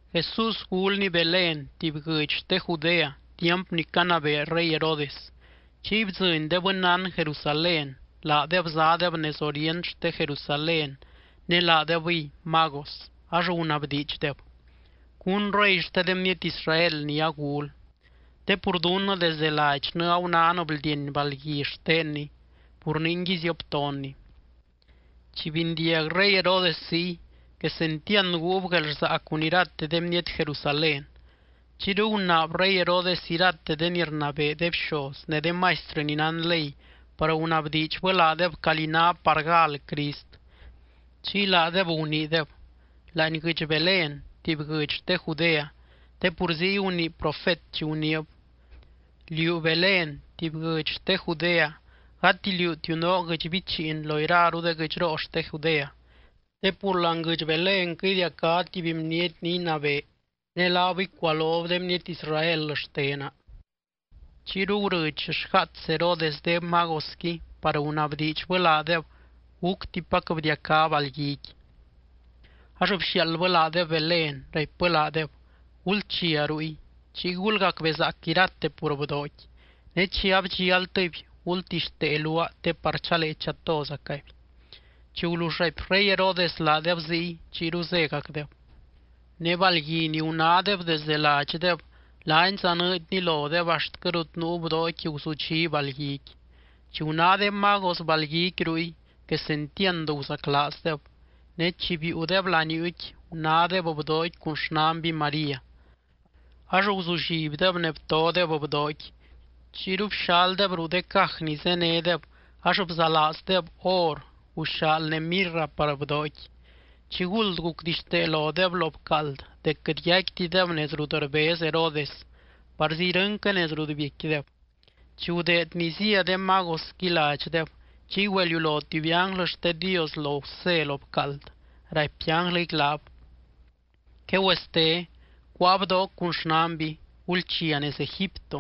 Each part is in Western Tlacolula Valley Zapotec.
Jesús gulny Belén tuby guɨdx xte Judea tiamp ni canabee rey Herodes. Chiy bdzɨny de bɨnnán Jerusalén, laadeb zádeb nez orient xte Jerusalén ne laadebɨy magos ax gunabdiidxdeb: —¿Cún rey xte de bniety Israel ni agul? Te pur dunnɨ desdɨ ladxnɨ agunán bldieny balgui xtenny. Pur ningui zioptonny. Chi bindiag rey Herodes ziy, quesentiand guub guelrsaa cun irate de bniety Jerusalén. Chiyru gunaab rey Herodes irate de ni rnabee de bxoz ne de maistrɨ ni nán ley par gunabdiidxbɨ laadeb calí ná par gal Crist. Chiy laadeb guniideb: —Láani guɨdx Belén tuby guɨdx xte Judea, te pur ziy gunii profet chi guniib: Liú Belén tuby guɨdx xte Judea, gati liútiu noo guɨdx bichiin lo iraru de guɨdxroo xte Judea. Te pur láani guɨdx Belénquɨ idiacá tuby bniety ni inabee, ne laab icualob de bniety Israel xtena. Chiyru gurɨdx xgaats Herodes de magosqui par gunabdiidxbɨ laadeb gúctipac bdiacá balguiqui. Ax bxiaaldbɨ laadeb Belén, raipbɨ laadeb: —Gulchia ruy, chiy gulgacbezaac irate pur bdooqui. Ne chi abdxialtɨby, gultixtee luaa te par chalee chatozacaby. Chi gulull raipy rey Herodes laadeb ziy, chiyru zégacdeb. Ne balgui ni gunádeb desde ladxdeb, laani zanɨɨdni lodeb axtquɨ rut nuu bdooqui guzudxí balguiqui. Chi guná de magos balguiqui ruy, quesentiand guzaclaazdeb. Ne chi biiudeb laniuuqui, gunádeb bdooqui cun xnanby María. Ax guzullibdeb ne btodeb bdooqui. Chiyru bxaldeb ruu de caj ni zénedeb ax bzalaazdeb or, guxaal ne mirra par bdooqui. Chiguld gucdixtee lodeb lo bcaald dec quɨt yaicquitideb nez rut rbez Herodes, parzi irɨnquɨ nez rut biecquideb. Chi gudeed ni zía de magosqui ladxdeb, chiy güeliulo tuby ánglɨ xte Dios lo Gusé lo bcaald, raipy ánglɨqui laab: —Quegüeste, cuáa bdooc cun xnanby. Gulchia nez Egipto,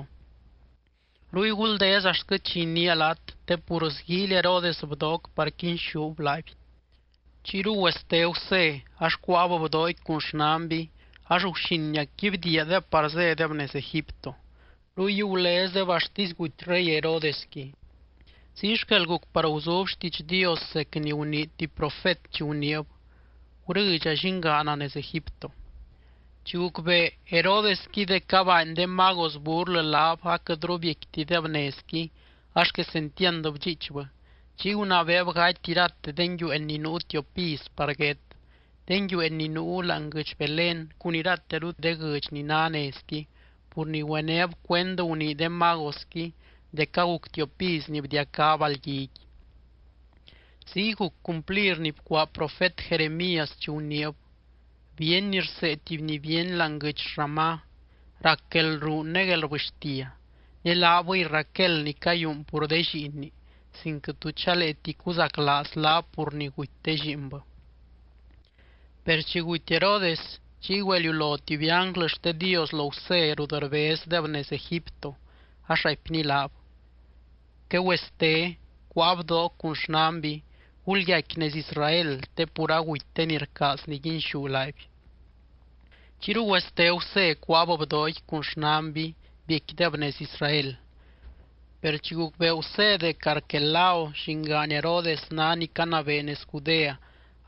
ruy guldez axt chi iniia laat. Te pur sguíily Herodes bdooc par quinxúb laaby. Chiyru güeste Gusé ax cuáab bdooqui cun xnanby ax guxiniacqui bdiiadeb par zédeb nez Egipto. Ruy gulezdeb axtisy guty rey Herodesqui. Ziy xquel guc par guzub xtiidx Dios zec ni gunii tuby profet chi guniib: “Gurɨdxa llingaana nez Egipto.” Chi gucbee Herodesqui dec abaany de magos burlɨ laab aquɨtru biecquitideb nezqui, ax quesentiand bdxiichbɨ. Chiy gunabeeb gaty irate de nguiueen ni nuu tiop iz par guét, de nguiueen ni nuu láani guɨdx Belén cun irateru de guɨdx ni ná nezqui, pur ni güenéb cuend gunii de magosqui dec aguc tiop iz ni bdiacá balguiqui. Ziy guc cumplir ni bcuaa profet Jeremías chi guniib: Bíeny rsee tuby ni bíeny láani guɨdx Ramá rac guelruun ne guelrbɨxtia. Ne laabɨy Raquel ni cayúun pur de lliinni sin quɨt tu chaleeti cuzaclaaz laab pur ni guty de lliinbɨ. Per chi guty Herodes, chiy güeliulo tuby ánglɨ xte Dios lo Gusé rut rbezdeb nez Egipto, ax raipny laab: —Quegüeste, cuáa bdooc cun xnanby. Gulyaicqui nez Israel te pur aguty de ni rcaaz niguinxú laaby. Chiyru güeste Gusé cuáab bdooqui cun xnanby biecquideb nez Israel. Per chi gucbee Gusé dec Arquelao llingaan Herodes ná ni canabee nez Judea,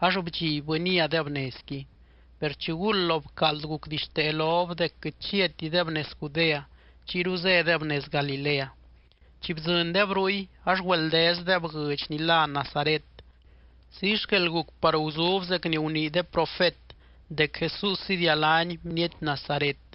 ax bdxibbɨ niadeb nezqui. Per chiguld lo bcaald gucdixtee lob dec quɨt chiatideb nez Judea, chiyru zédeb nez Galilea. Chi bdzɨndeb ruy, ax güeldezdeb guɨdx ni lá Nazaret. Ziy xquel guc par guzub zec ni gunii de profet dec Jesús idialány bniety Nazaret.